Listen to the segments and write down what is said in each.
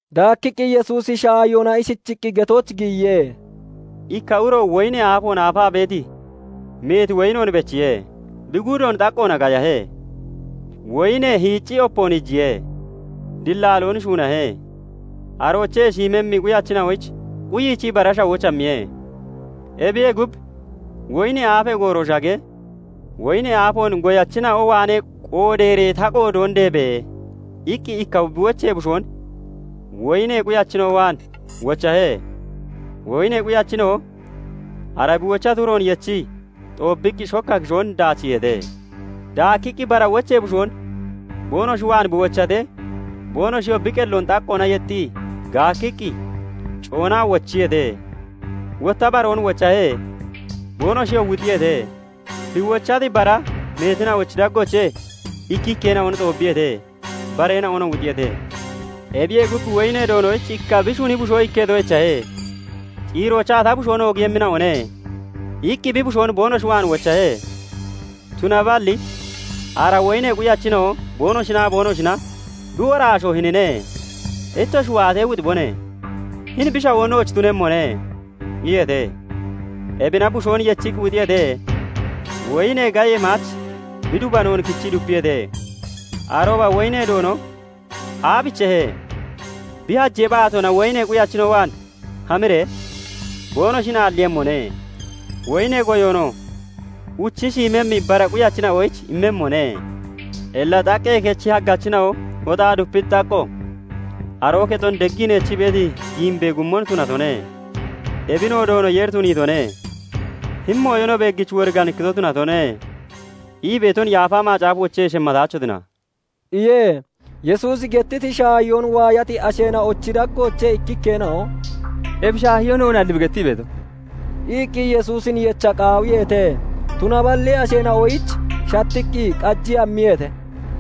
Daakkiqqi Yesuusi shaahiyoona ishichiqqi getooch giyiye; "Ikka uro woyinee aafoon aafaa beeti meeti woyinoon bechiye;bi guudoon xaqqoona gayahe; woyinee hiicci opoon iijiye; dilaaloon shuunahe; aroochee shiimmemmi quyachina'oyich quyichii bara shawooch hammiye. Ebiyee gub, woyinee aafee gooroo shagee, "Woyinee aafoon goyachina'o waanee qoodeeree ta qoodoon deebe!" iqqi ikka bi wochee bushoon woyinee quyachina'o waan wochahe. Woyinee quyachina'oo ara bi wochati uroon yechii xoobbiqqi shokka kishoon daachiiheete. Daakkiqqi bara wochee bushoon boonoshi waan bi wochatee, boonoshiyoo bi qelloon xaqqoona yexxii gaakkiqqi coonaa wochiyeete. Wotta baroon wochahe. Boonoshiyoo wuxiyeete. Bi wochati bara meetina'ochi daggoochee ikkikkeena'on xoobbiyeete; bareena'onoo wuxiyeete. Ebiyee gub, woyinee doonoyich ikka bi shuni bushoo ikketo echahe. Ciiroochaa "Ta bushoon oogiiyemmina'one" iqqi bi bushoon boonoshi waan wochahe. Tunaballi ara woyinee quyachina'o boonoshinaa boonoshina "Bi woraasho hinine. Ittoshi waatee wuxibone. Hini bi shawoo nooch tunemmone " iyeete. Ebina bushoon yechiqqi wuxiyeete; woyinee gayee maach bi dubanoon kichii dupiyeete. Arooba woyinee doono aabichehe? Bi hajee baatoona woyinee quyachina'o waan hamiree boonoshin aalliiyemmone. Woyinee goyoonoo uchi shiimemmi bara quyachina'oyich immemmone. "Illa 'xaqqee kechi hagachina'o hoxaa dupiti xaqqo, aroo kexon deggii neechii beeti giimbee guumon tunatone. ebinoo Doono Yeeri tuniitone. hini mooyo no beeggich woriganikkito tunatone' ii beeton Yaafa Macaafoochee shemmataachotina" iye. Yesuusi gettiti shaahiyoon waayati asheena'ochi daggoochee ikkikkeena'o "Ebi shaahiyoo noonalli bi gettii beeto" iqqi Yesuusin yecha qaawiyeete; tunaballi asheena'oyich shattiqqi qajii hammiyeete.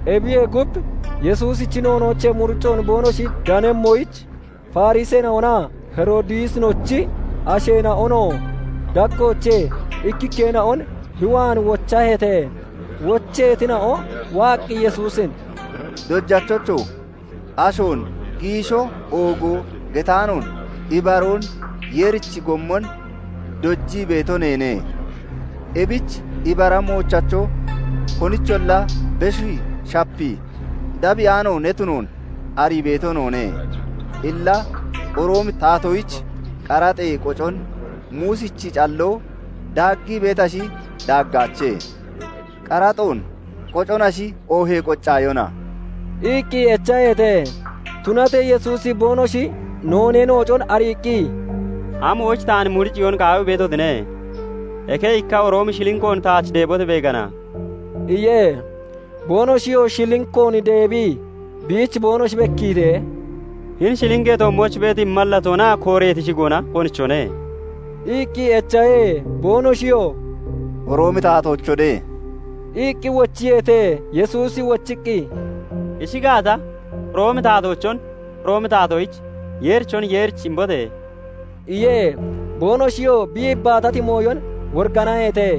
Ebiyee gub, Yesuusichi noonoochee muricoon boonoshi danemmoyich, Fariseena'onaa Heroodisinochi asheena'ono daggoochee ikkikkeena'on bi waan wochaheete. Wocheetina'o waaqqi Yesuusin "Dojachocho! Ashoon giisho oogo getaanoon ibaroon Yeerichi gommon dojii beeto neene. Ebich ibara moochacho, konicholla beshii shapii dabbiyaano ne tunoon arii beeto noone. Illa Roomi taatoyich qaraxee qocon Muusichi calloo daaggii beetashi, daaggaache? Qaraxoon qoconashi oohee qoccaayona?" iqqi echaheete. Tunatee Yesuusi boonoshi noonee noocon ariiqqi, "Amoyich taan muriciyoon qaawii beetotine? Eke ikka Roomi shilinkoon taach deebote! beegana" iye. Boonoshiyoo Shilinkoon deebii biich boonoshi bekkiitee, "Hini shilinkee toommooch beeti mallatoonaa kooreeti shigoona konichone?" iqqi echahe. Boonoshiyoo "Roomi taatoochone" iqqi wochiyeete. Yesuusi wochiqqi, "Ishi gaata, Roomi taatoochon Roomi taatoyich, Yeerichon Yeerich imbote!" iye. Boonoshiyoo bi yibbaatati mooyon woriganaheete.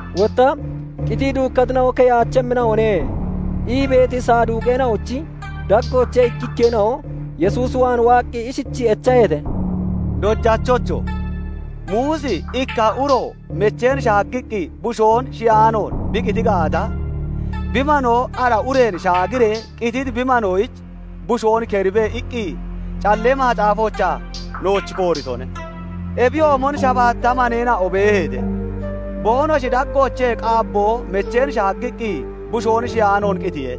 Wotta "Qitii duukkatina'o keyaachemmina'one " ii beeti Saduuqeena'ochi daggoochee ikkikkeena'o Yesuus waan waaqqi ishichii echaheete; "Dojachocho! Muusi 'Ikka uro mecheen shaaggiqqi bushoon shiyaanoon bi qiti gaata, bi manoo ara ureen shaagiree qititi bi manoyich bushoon keribe' iqqi Callee Macaafoochaa nooch kooritone. Ebiyoomon shabaatta maneena'o beeheete; boonoshi daggoochee qaabboo mecheen shaaggiqqi bushoon shiyaanoon qitiye.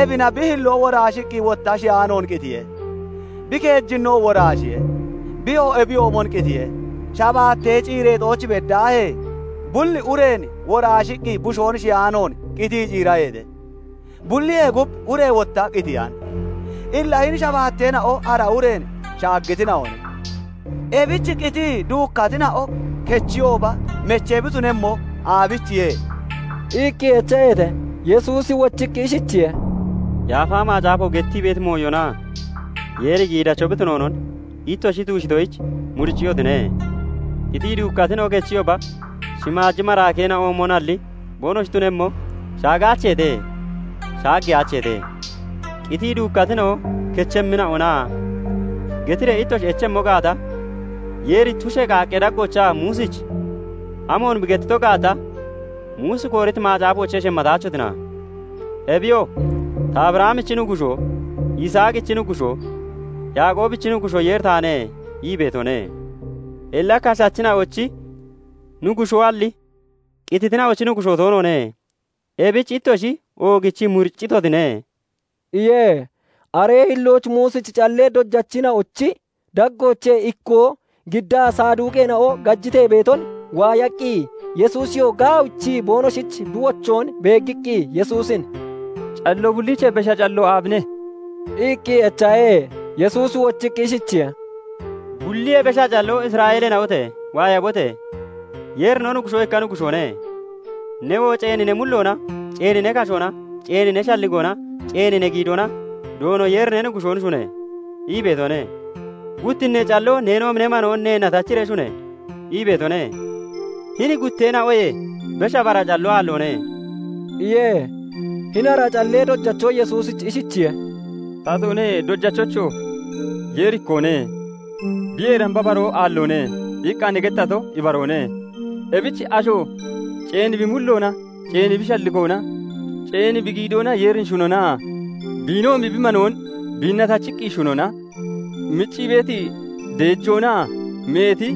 Ebina bi hilloo woraashiqqi wotta shiyaanoon qitiye. Bi keejinno woraashiye; biyoo ebiyoomon qitiye. Shabaattee ciireexooch beddaahee bulli ureen woraashiqqi bushoon shiyaanoon qitii ciiraheete. Bulliyee gub ure wotta qitiyan. Illa hini shabaateena'o ara ureen shaagitina'one. Ebich qitii duukkatina'o kechiyooba mechee bi tunemmo aabichiye?" iqqi echaheete. Yesuusi wochiqqi ishichiye:- "Yaafa Macaafo gettii beeti mooyonaa Yeeri giidacho bi tunoonon ittoshi tuushitoyich muricciyotine. Qitii duukkatina'o kechiyooba shimaaji maraakeena'oomonalli boonoshi tunemmo shaagaacheete; shaageyaacheete. 'Qitii duukkatina'o kechemmina'ona?' getiree ittoshi echemmo gaata, Yeeri tushee qaaqqee daggoochaa Muusich amoon bi gettito gaata, Muusi kooriti macaafoochee shemmataachotina? Ebiyoo 'Ta Abrahamichi Nuggushoo, Yisaaqichi Nuggushoo, Yaaqoobichi Nuggushoo Yeeri taane' ii beetone. Illakashachina'ochi Nuggushoalli qititina'ochi Nuggushoo toonoone. Ebich ittoshi oogichii muriccitotine" iye. Aree hillooch Muusichi callee dojachina'ochi daggoochee ikkoo giddaa, Saduuqeena'o gajitee beeton waayaqqi, Yesuusiyoo gaawichii boonoshich bi wochoon beeggiqqi, Yesuusin "Calloo bulliichee besha calloo aabine?" iqqi echahe. Yesuusi wochiqqi ishichiye:- "Bulliyee besha calloo 'Isra'eeleena'ote! Waayabote! Yeeri no Nuggushoo ikka Nuggushoone. Newoo ceeni ne mulloona, ceeni ne kashoona, ceeni ne shalligoona, ceeni ne giidoona YDoono eeri ne Nuggushoon shune!' ii beetone. Guttinnee calloo 'Neenoomi ne manoon neenna tachiree shune!' ii beetone. Hini gutteena'oyee besha bara calloo aalloone" iye. Hini ara callee dojacho Yesuusich ishichiye:- "Tatoone, Dojachocho! 'Yeeri ikkoone; biyee damba baroo aalloone' iqqa ne gettato ibaroone. Ebich asho ceeni bi mulloona, ceeni bi shalligoona, ceeni bi giidoona Yeerin shunonaa biinoomi bi manoon biinna tachiqqi shunona miccii beeti deejoonaa meeti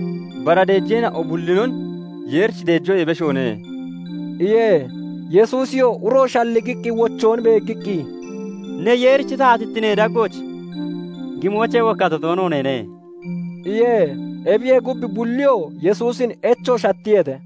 bara deejeena'o bullinon Yeerich deejoyee beshoone" iye. Yesuusiyoo uro shalligiqqi wochoon beeggiqqi, "Ne, Yeerichi taatittinee daggooch gimoochee wokkato toono neene" iye. Ebiyee gub, bulliyoo Yesuusin echo shattiyeete.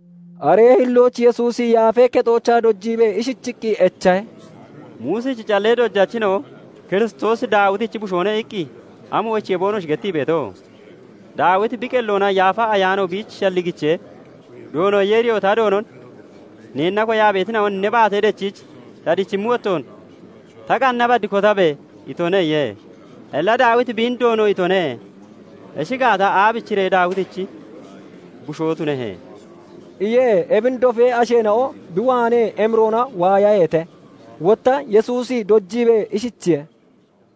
Aree hillooch Yesuusi Yaafee Kexoochaa dojiibee ishichiqqi echahe; "Muusichi callee dojachina'o 'Kiristoosi Daawitichi bushoone' iqqi amoyichiye boonoshi gettii beeto? Daawiti bi qelloona Yaafa Ayaano biich shalligichee, 'Doono Yeeriyoo ta Doonon "Neenna koyaa beetina'on ne baate dechiich ta dichimmi wottoon ta qanna bad kotabe!" itone' iye. Illa Daawiti biin 'Doono' itone. Ishi gaata, aabichiree Daawitichi bushoo tunehe?" iye. Ebin dofee asheena'o bi waanee emiroona waayaheete. Wotta Yesuusi dojiibee ishichiye:-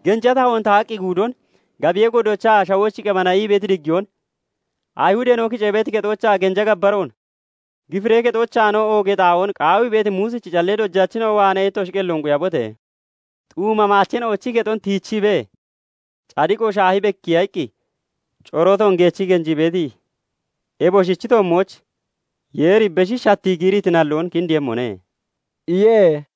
"Genja tahoon tahaqqi guudon, gabiyee godoochaa 'Shawooch qebana' ii beeti diggiyoon, Ayihudeena'o kicee beeti kexoochaa genja gabbaroon, gifiree kexoochaanoo oogee xaa'oon qaawii beeti Muusichi callee dojachina'o waanee ittoshi qelloon quyabote! Xuuma maacheena'ochi kexon tiichiibee cadiqo shaahi bekkiya iqqi corootoon geechii genjii beeti ebosichi toommooch Yeeri beshi shattii giiriiti nalloon kindiiyemmone" iye.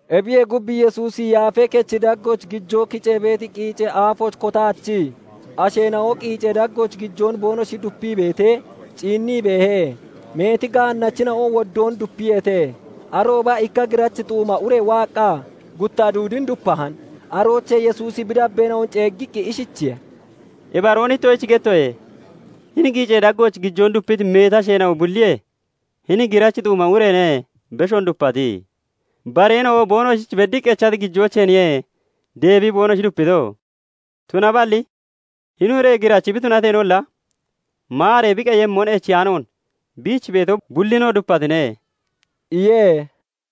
Ebiyee gub, Yesuusi Yaafee Kechi daggooch gijoo kicee beeti qiicee aafooch kotaachii, asheena'o qiicee daggooch gijoon boonoshi dupii beetee ciinnii beehe. Meeti gaannachina'o woddoon dupiyeete. Arooba ikka girachi xuuma ure waaqqa gutta duudin dupahan. Aroochee Yesuusi bi dabbeena'on ceeggiqqi ishichiye:- "Ibaroon ittoshich gettoye; hini qiicee daggooch gijoon dupiti meeti asheena'o bulliyee hini girachi xuuma ureene beshoon dupati. Bareena'o boonoshich beddiqqi echati gijooceenniye deebii boonoshi dupito; tunaballi hini ure girachi bi tunateenolla maaree bi qeyemmon echiyaanoon biich beeti bullinoo dupatine" iye.